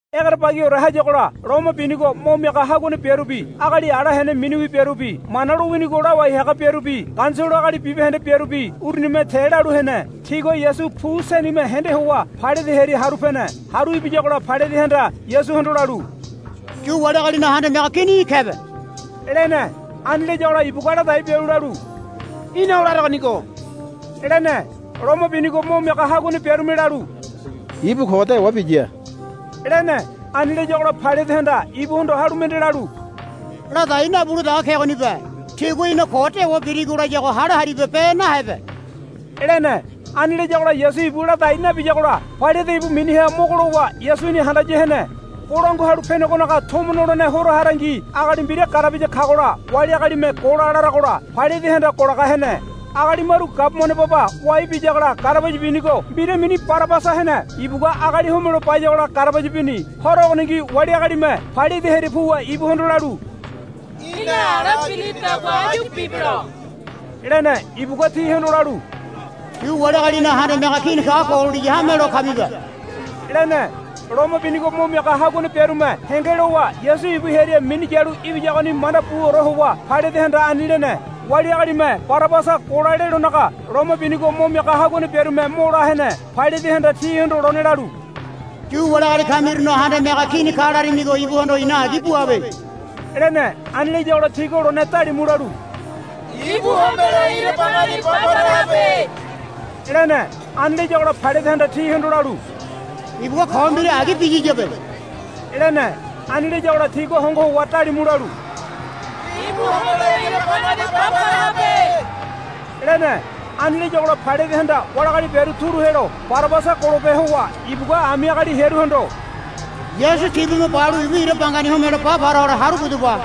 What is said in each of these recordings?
Egerebagiore hayagola loma binigo mo miaga haguane biarubi agali ala hene miniwi biarubi Mana lowinigo lawai haga biarubi Ganisolo agali bibahende biarubi urunime te lalu hene. Tigua Yasu pu senime hende howa Pailate hearia haru pene. Haru ibiyagola Pailatehanda Yasuhondo lalu, Yu wali agalinaga handame haga kini í̠ kebe, lene. Ani layagola ibugua ladai bialu lalu, Í̠na o laregonigo, lene. Loma binigo mo miaga haguane biarume lalu, Ibu ko dewa biya, lene. Ani layagola Pailatehanda ibuhondo halu mende lalu, Ladai nabule dege kegonibe. Tigua í̠na ko dewa birigo layago hale haribe be nahebe, lene. Ani layagola Yasu ibu ladai nabiyagola Pailate ibu miniha mogo lowa Yasuni handaya hene. Bolangua Halu Penegonaga Tomo nolene horo harangi agali mbira garabaya kagola wali agalime, Gola, laragola Pailatehanda golaga hene. Agali maru gabumane baba wai biyagola garabaya binigo mbira mini Barabasa hene. Ibugua agali homelo bayagola garabaya bini. Horo ogoningi wali agalime Pailate hearia puwa ibuhondo lalu, Í̠na ala birilidagua áyu bibelo, lene. Ibugua tihondo lalu, Yu wali agalinaga Handame Haga Kini kago gololiya hamelo kamibe, lene. Loma binigo mo miaga haguane biarume henge lowa Yasu ibu hearia minu yalu ibiyagoni manda buore howa Pailatehanda ani lene. Wali agalime, Barabasa gola, lelonaga Loma binigo mo miaga haguane biarume mo la hene. Pailatehanda tihondo lone lalu, Yu wali agali kamirunaga Handame Haga Kini ka larimigo ibuhondo i̱na agi buabe, lene. Ani layagola tigua lone dalimu lalu, Ibu homelo ira bangani ba para habe, lene. Ani layagola Pailatehanda tihondo lalu, Ibugua ko mbira agi biyiyabe, lene. Ani layagola tigua hongo howa dalimu lalu, Ibu homelo ira bangani ba para habe, lene. Ani layagola Pailatehanda wali agali biaru turu helo Barabasa golope howa ibugua ami agali hearuhondo, Yasu tibume balu ibu ira bangani homelo ba para hole haru pudaba,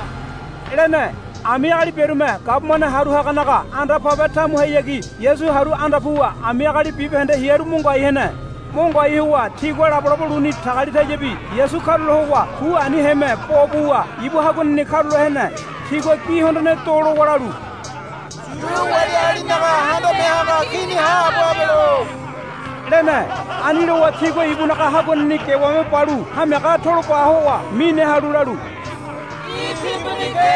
lene. Ami agali biarume gabumane haru haganaga anda pabe tamuhayagi Yasu haru anda puwa ami agali bibahende hearu mo ngoai hene. Mo ngoai howa tigua labolabo luni tagalitayabi Yasu karula howa pu aniheme bo buwa ibu haguaneni karula hene. Tigua gi hondone do lowa lalu, Yu wali agalinaga Handame Haga Kini haabo habelo, lene. Ani lowa tigua ibunaga haguaneni gewame balu hamiaga tolo ba howa mine halu lalu, Í̠ timbuni ke,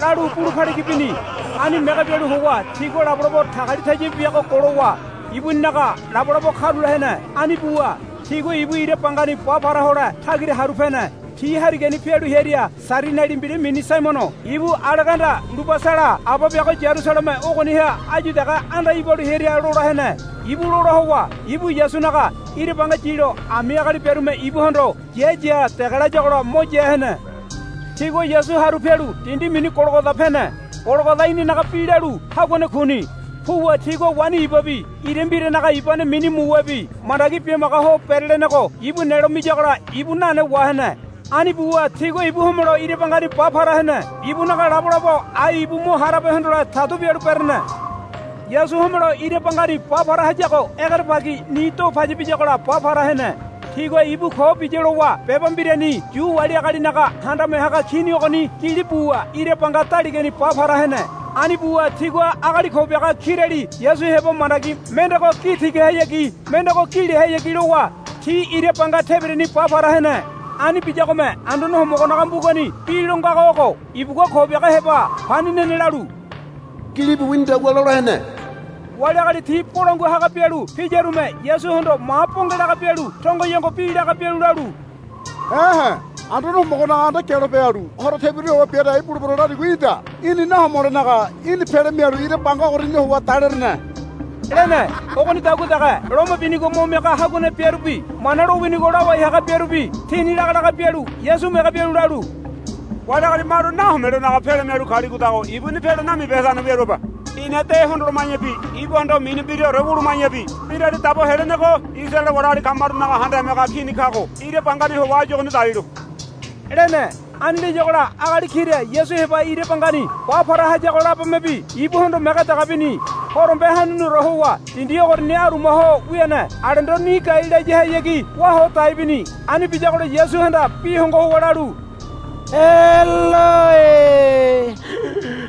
lalu bulu paligi bini. Ani mege bialu howa tigua labolabo tagalitayabi biago golowa ibuninaga labolabo karula hene. Ani buwa tigua ibu ira bangani ba para hole tagira haru pene. Ti harigani pialu hearia Sairiniali mbira mini Saimono ibu Aleganda Lubasala aba biago Yarusaleme ogoniha áyu dege anda ibalu hearia lola hene. Ibu lola howa ibu Yasunaga ira banga yilo ami agali biarume ibuhondo, Ya ya, dege layagola mo ya hene. Tigua Yasu haru pialu dindi mini Gologoda pene. Gologoda inanaga bi lalu, Haguane Kuni. Puwa tigua waini ibabi ira mbiranaga ibane mini muwebi mandagi bimaga ho berelenego ibu nelo miyagola ibu nane wahene. Ani buwa tigua ibu homelo ira bangani ba para hene. Ibunaga labolabo ai ibu mo harabe hondole tadu bialu berene. Yasu homelo ira bangani ba para hayago egerebagi ni do paya biyagola ba para hene. Tigua ibu ko biya lowa beba mbirani, Yu wali agalinaga Handame Haga Kini ogoni, gili buwa ira banga daligani ba para hene. Ani buwa tigua agali ko biaga kirali Yasu heba mandagi mendego gi tigahayagi mendego gi lehayagi lowa ti ira banga tebirani ba para hene. [ Ani biyagome Anduane Homogonaga mbugani bi lo ngago ogo, Ibugua ko biaga heba pani nene, lalu gilibu winidagua lola hene.] Wali agali ti bolangua haga bialu piyarume Yasuhondo ma bonge laga bialu tongoyongo bi laga bialu lalu, E̱he. Anduane Homogonaga anda gialope halu horo tebira howa bia dai bulebero, larigo í̠da. Í̠ni nahomolenaga í̠ni pele mialu ira banga ogoriani howa dalerene, lene. Ogonidagua dege loma binigo mo miaga haguane biarubi Mana lowinigo lawai haga biarubi tini laga laga bialu Yasu mege bialu lalu, Wali agali maru nahomelonaga pele mialu kaligodago ibuni pele namibehedane wiaruabe. Ina de hondoloma̱yabi ibuhondo mini mbiraore wuluma̱yabi Mbirali Dabo Helenego Isaraele wali agali kamarunaga Handame Haga Kini kago ira bangani howa áyu ogoni dalilo, lene. Ani layagola agali kira Yasu heba ira bangani ba para hayago labomebi ibuhondo mege dege bini. Horombe hanuniore howa dindi ogoriani aruma ho wiane alendo ni gai layahayagi wá ho dai bini. Ani biyagola Yasuhanda bi hongo howa lalu, Eloi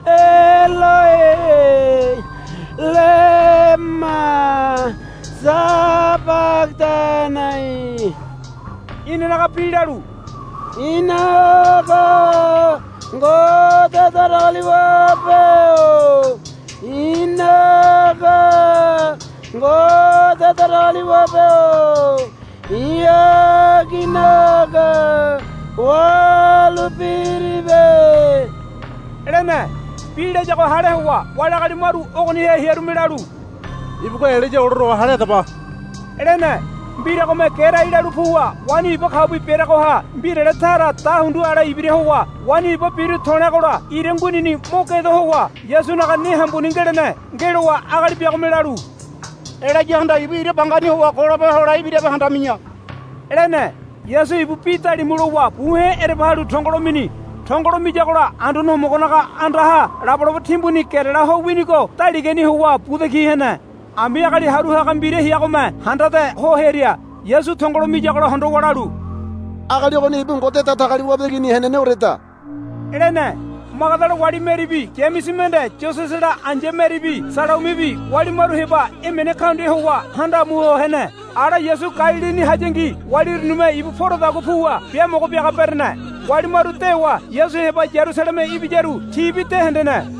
Eloi lema sabagadanai. Inanaga bi lalu, I̱naga Ngode Datagaliwabe-o i̱naga Ngode Datagaliwabe-o i̱ aginaga wahalu piribe, lene. Bi layago hale howa wali agali maru ogoniha hearume lalu, Ibugua Elaya olaruago hale hadaba, lene. Mbiragome gerai lalu puwa waini iba kaubi bereagoha mbirale tara dahundu ale ibira howa waini iba biru to̱leagola ira nguinini mo gedo howa Yasunaga ne hambuni ngelene. Ngelowa agali biagome lalu, Elayahanda ibu ira bangani howa golope hole ibirabe handami̱ya, lene. Yasu ibu bi dalimu lowa buhe̱ ereba halu tongolo mini. Tongolo miyagola Anduane Homogonaga andaha labolabo timbuni gerela ho winigo daligani howa buda ki hene. Ami agali haru haga mbira heagome handade ho hearia Yasu tongolo miyagola hondowa lalu, Agali ogoni ibu Ngode Datagaliwabe Igini heneneoreda, lene. Magadala wali Meribi Yamese mende Yosesela ai̱ya Meribi Salaumibi wali maru heba emene kaundia howa handa amu ho hene. Ala Yasu Galilini hayangi wali urunime ibu poradagua puwa biamogo biaga berene. Wali maru dewa Yasu heba Yarusaleme ibiyaru tibi de hendene.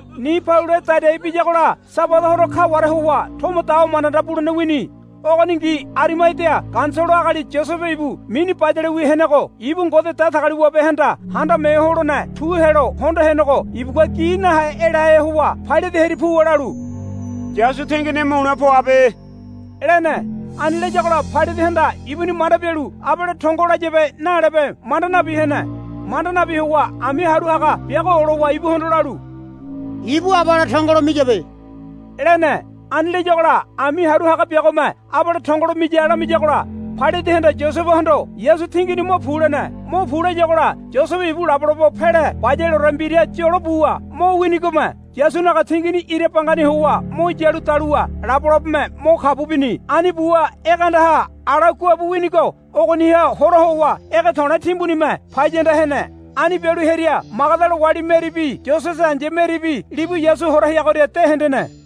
Ni palue dadai biyagola Sabada horo kaware howa tomo dawa manda manda bulene wini. Ogoningi Arimadia Ganisolo agali Yosebe ibu mini bayalewi henego ibu Ngode Datagaliwabehanda Handame Ho Holene tu helo hondo henego ibugua gi nahe elahe howa Pailate hearia puwa lalu, Yasu tingini mule poabe, lene. Ani layagola Pailatehanda ibuni manda bialu abale tongo layabe nalebe manda nabi hene. Manda nabi howa ami haru haga biago olowa ibuhondo lalu, Ibu abale tongolo miyabe, lene. Ani layagola ami haru haga biagome, Abale tongolo miya, lamiyagola Pailatehanda Yosebehondo, Yasu tingini mo pu, lene. Mo pu, layagola Yosebe ibu labolabo pele bayaleore mbira yolo buwa mo winigome Yasunaga tingini ira bangani howa mo yalu daluwa labolabome mo kabu bini. Ani buwa ege andaha ala guabu winigo ogoniha hora howa ege to̱le̱ timbunime paya anda hene. Ani bialu hearia Magadala wali Meribi Yosese ai̱ya Meribi libu Yasu hora heagoria de hendene.